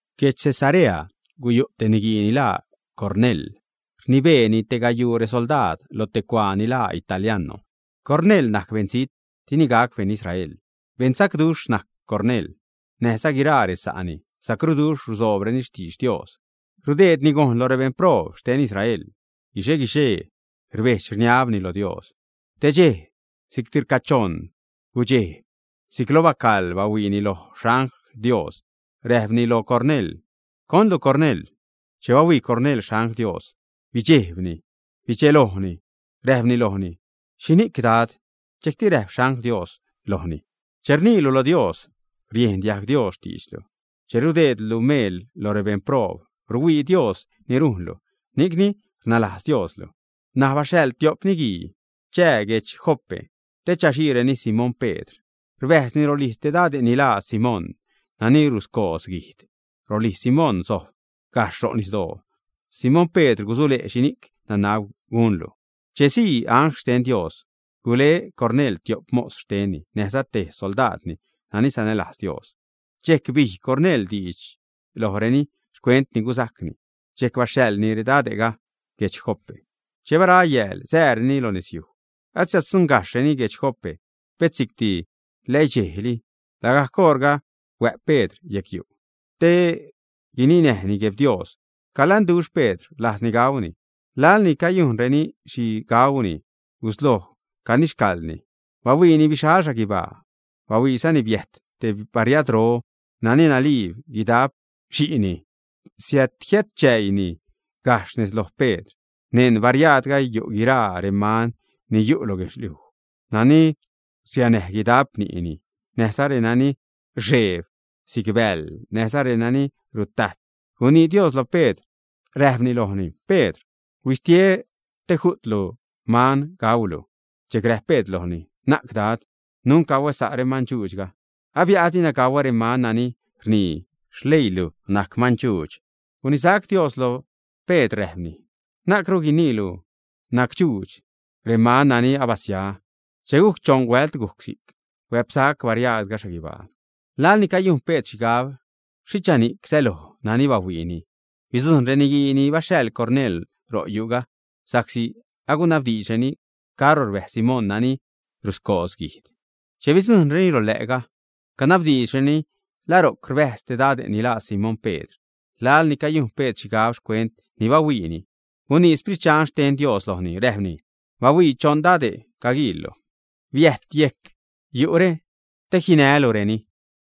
Guedx Cesarea guyu' te niguii ni laa Cornel. Rnibeeni te gayuu resoldaad lo te cuaa ni laa Italiano. Cornel najc beṉzijt, dini gac beṉ Israel. Beṉsacduxh najc Cornel, näjza guiraa resa'ni, sacruduxh rusoobreni xtidx Dios. Rudeedni gojn lo rebeṉ proob xten Israel. Guixe-guixee rbejdx, rniabni lo Dios. Te dxej, si'cti rcachoṉ gudxej, si'c lo bacaḻ bahuiini loj xangl Dios, räjpni loj Cornel: ―¿Conlu Cornel? Che bahuii Cornel xangl Dios, bidxejbni, bidxelojni, räjpni lojni: ―¿Xhini'c, Dad? Dxejcti räjp angl xten Dios lojni: ―Che rniilu lo Dios, riejn diajg Dios xtiidxlu, che rudeedlu meel lo rebeṉ proob, ruhuii Dios ni rujnlu, ni'cni rnalajz Dios luj. N̲aj baxhaḻ tiop niguii chää guedx Jope te chaxiireni Simón Pedr. Rbäjzni rolijz te dade' ni laa Simón nani ruscoodz guijd. Rolijz Simón sojb gajxh ro' nisdoo. Simón Pedr gusule' xhini'c nanab gunlu. Che sii angl xten Dios, gule Cornel tiop mos xtenni näjza te xsoldaadni nani sanälajz Dios. Dxejc bij Cornel diidx lojreni xcuent ni gusajcni, dxejc baxhaḻni redade'ga guedx Jope. Che bara yääl, sääreni lo nezyuj. Asiäddzuṉgajxhreni guedx Jope, pet si'cti läidxejni. Lagajc oṟga huä'p Pedr yecyu' te guininäjni Guejb Dios. Calanduxh Pedr, rlajzni gauni. Laḻ ni cayujnreni xhi gauxhuejni, gusloj canixcaḻni. Bahuiini bixal xhaguibaa, bahuiizani biäjt te bariadro nani naliib guidap xi'ni. Siädjiätchäiini gajxh nez loj Pedr. Neṉ bariaadga yu' guiraa reman ni yu' lo guedxliuj nani rsianäj guidap ni'ni, näjza renani rxeeb si'c bäḻ, näjza renani rutajt. Gunii Dios lo Pedr, räjpni lojni: ―Pedr, huisu te ju'tlu man gaulu. Dxejc räjp Pedr lojni: ―Na'c Dad. Nunc gauä sa' remandxuudxga, abia'a dina gauä reman nani rnii xleiilu najc mandxuudx. Gunisac Dios loj Pedr, räjpni: ―Na'cru guiniilu nacdxuudx reman nani abasia. Che gujc choṉ huält gujc si'c, huä'psac bariaadga xhaguibaa. Laḻ ni cayujn Pedr xhigab xhichani'c säloj nani bahuiini, bidzujṉ reniguii ni baxhaḻ Cornel ro' yu'ga, sa'csi agunabdiidxreni caro rbäjz Simón nani ruscoodz guijd. Che bidzujṉreni rolä'ga canabdiidxreni la ro'c rbäjz te dade' ni laa Simón Pedr. Laḻ ni cayujn Pedr xhigab xcuent ni bahuiini, gunii Sprit Dxan xten Dios lojni, räjpni: ―Bahuii, choṉ dade' caguiillu. Biäjt yejc yu're te jinälureni.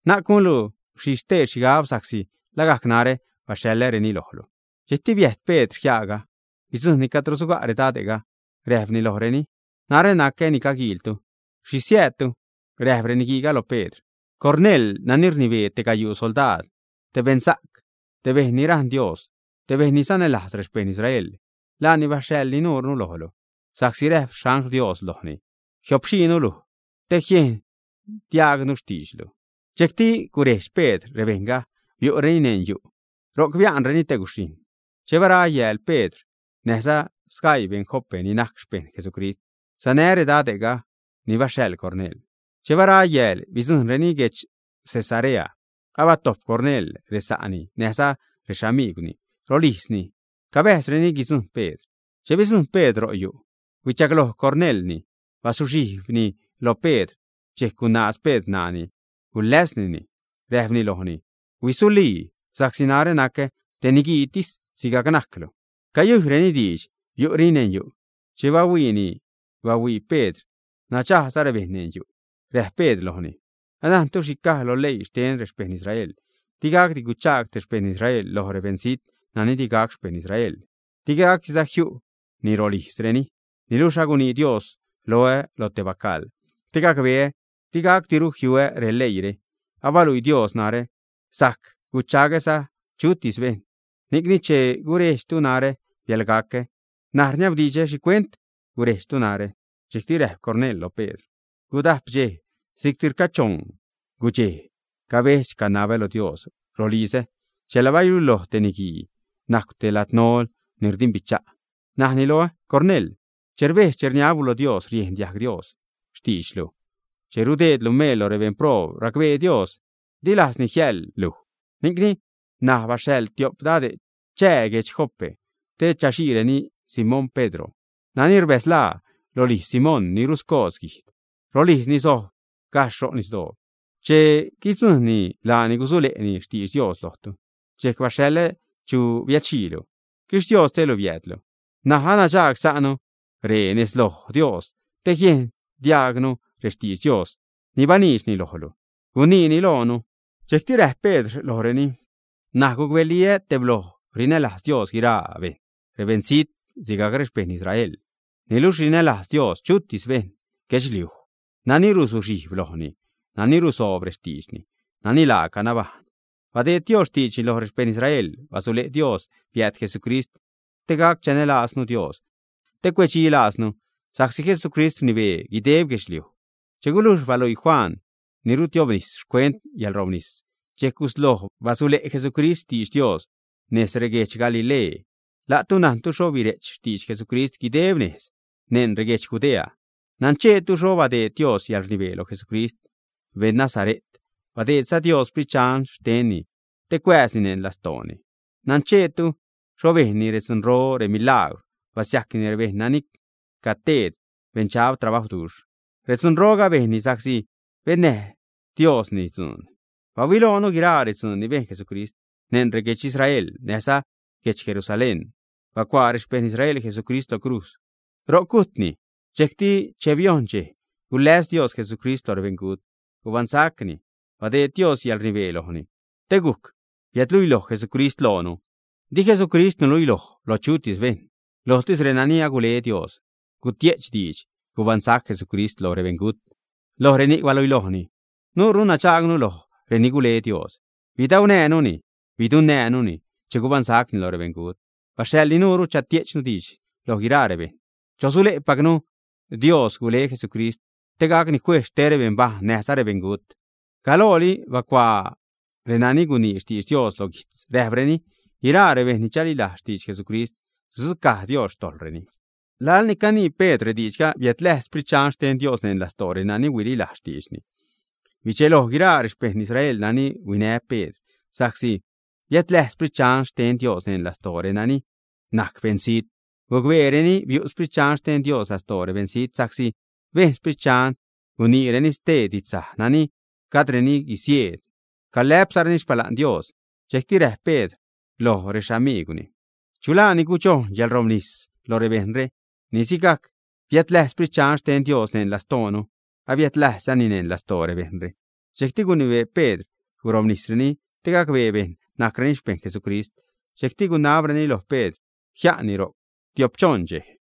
Na'c gunlu xhi stee xhigab, sa'csi lagajc narä baxhaḻäreni lojlu. Dxejcti biäjt Pedr jiaaga, bidzujṉni cadro suga' redade'ga, räjpni lojreni: ―Narä nacä ni caguiiltu. ¿Xhi siäädtu? Räjp reniguiiga lo Pedr: ―Cornel, nani rnibee te gayuu soldaad, te beṉsa'c, te bejṉ ni rajṉ Dios, te bejṉ ni sanälajz rexpejṉ Israel, laani baxhaḻ nuure lojlu, sa'csi räjp angl xten Dios lojni, jiopxiinu luj te jiejn diajgnu xtiidxlu. Dxejcti gurejdx Pedr rebejṉga, biu'reni neṉ yu'. Ro'c bia'nreni te guxhijṉ. Che bara yääl, Pedr näjza sgaii beṉ Jope ni najc xpejṉ Jesucrist, sanä redade' ni baxhaḻ Cornel. Che bara yääl, bidzujṉreni guedx Cesarea. Abatojp Cornel resa'ni näjza rexamigwni rolijzni. Cabäjzreni guidzujṉ Pedr. Che bidzujṉ Pedr ro yu', huichagloj Cornelni, bazuxhijbni lo Pedr. Dxejc gunaaz Pedr ṉaani, guläsnini, räjpni lojni: ―Huisulii, sa'csi narä nacä te niguiitis sigajc najclu. Cayuiireni diidx, biu'reni neṉ yu'. Che biu'ni bahuii Pedr nadxagsa' rebejṉ neṉ yu'. Räjp Pedr lojreni: ―Anajntu xhi caj lo leii xten rexpejṉ Israel: digacdi guchaag te xpejṉ Israel loj beṉzijt nani digac xpejṉ Israel, digacdiza jiu'ni rolijzreni. Niluxh agunii Dios loä lo te bacaḻ, te gacbeä digacdiru jiuä releiire. Abaluii Dios narä sajc guchagsa'ä chutis bejṉ. Ni'cni, che gurejdxtu narä biälgacä. N̲aj rniabdidxä, ¿xhicuent gurejdxtu narä? Dxejcti räjp Cornel loj Pedr: ―Gudajp dxej si'cti rcachoṉ gudxej, cabedx-canabä lo Dios rolizä chela baluiloj te niguii najcw te ladnol ni rdimbicha'. Najni loä: “Cornel, che rbedx-rniablu lo Dios, riejn diajg Dios xtiidxlu, che rudeedlu meel lo rebeṉ proob, racbee Dios, di lajzni jiäḻ luj. Ni'cni ṉaj baxhaḻ tiop dade' chää guedx Jope te chaxiireni Simón Pedr nani rbäzlaa rolijz Simón ni ruscoodz guijd. Rolijzni sojb gajxh ro' nisdoo. Che guidzujṉni, laani gusule'ni xtidx Dios lojtu.” Dxejc baxhaḻä chu biädxiilu. Xquixtiostelu biäädlu. N̲aj anadxagsa'nu ree nez loj Dios te jiejn diajgnu rextidx Dios ni baniidxni lojlu guiniilu loonu. Dxejcti räjp Pedr lojreni: ―N̲aj gucbeliä tebloj rinälajz Dios guiraa bejṉ; rebeṉzijt sigajc rexpejṉ Israel. Niluxh rinälajz Dios chutis beṉ guedxliuj nani ruzuxhijb lojni, nani rusoob rextiidxni, nani laaca nabajṉ. Badeed Dios xtiidxni loj rexpejṉ Israel, basule' Dios biääd Jesucrist te gac chanälaaznu Dios te cuedxilajznu, sa'csi Jesucrist rnibee guideb guedxliuj. Che gulujx baluii Juan ni rutiobnis xcuent yäḻrobnis, dxejc gusloj basule' Jesucrist xtidx Dios nez reguedx Galilee. La'tu najntu xho bire'ch xtidx Jesucrist guideb nez neṉ reguedx Judea. Nancheetu xho badeed Dios yäḻrnibee loj Jesucrist, beṉ Nazare't. Badeedza Dios Sprit Dxan xtenni te cuääzni neṉ lastooni. Nancheetu xho bejnni redzunro, remilagwr, basiajcni rebejṉ nani caguteed beṉdxab trabajwduxh. Redzunroga bejnni sa'csi bennäj Diosni dzuun. Bahuiloonu guiraa redzuun ni bejn Jesucrist neṉ reguedx Israel näjza guedx Jerusalén. Bacuaa rexpejṉ Israel Jesucrist lo crujz, ro'c gujtni. Dxejcti che biojṉ dxej, guläs Dios Jesucrist lo rebeṉgut, gubaṉsacni, badeed Dios yäḻrnibee lojni te gujc biädluiloj Jesucrist loonu. Di Jesucrist nuluiloj loj chutis bejṉ. Lojtis renani agule Dios gutie'ch diidx gubaṉsac Jesucrist lo rebeṉgut, loj reni'c baluilojni. Nuure nadxagnu loj reni gule Dios. Bidaunänuni, bidunnäänuni che gubaṉsacni lo rebeṉgut. Baxhaḻni nuure chatie'chnu diidx loj guiraa rebejṉ, chosule'pacnu Dios gule Jesucrist te gacni juejz xte rebeṉbajṉ näjza xte rebeṉgut. Galooli bacuaa renani gunii xtidx Dios lo guijtz, räjpreni: “Guiraa rebejṉ ni chalilajz xtidx Jesucrist sudzucaj Dios xtojḻreni.” Laḻ ni canii Pedr rediidxga, biädläjz Sprit Dxan xten Dios neṉ lastoo renani huililajz xtiidxni. Bidxeloj guiraa rexpejṉ Israel nani huinä Pedr sa'csi biädläjz Sprit Dxan xten Dios neṉ lastoo renani najc beṉzijt. Gucbeereni biu' Sprit Dxan xten Dios lastoo rebeṉzijt sa'csi bejn Sprit Dxan guniireni stee didxsaj nani gajdreni guisieed, calä'pzareni xpala'n Dios. Dxejcti räjp Pedr lo rexamiigwni: ―Chu laa ni gudxojn yäḻrobnis lo rebejṉre, ni sigajc biädläjz Sprit Dxan xten Dios neṉ lastoonu, abiädläjzni neṉ lastoo rebejṉre. Dxejcti gunibee Pedr gurobnisreni te gacbee bejṉ najcreni xpejṉ Jesucrist. Dxejcti gunabreni loj Pedr jia'nni ro'c tiop-choṉ dxej.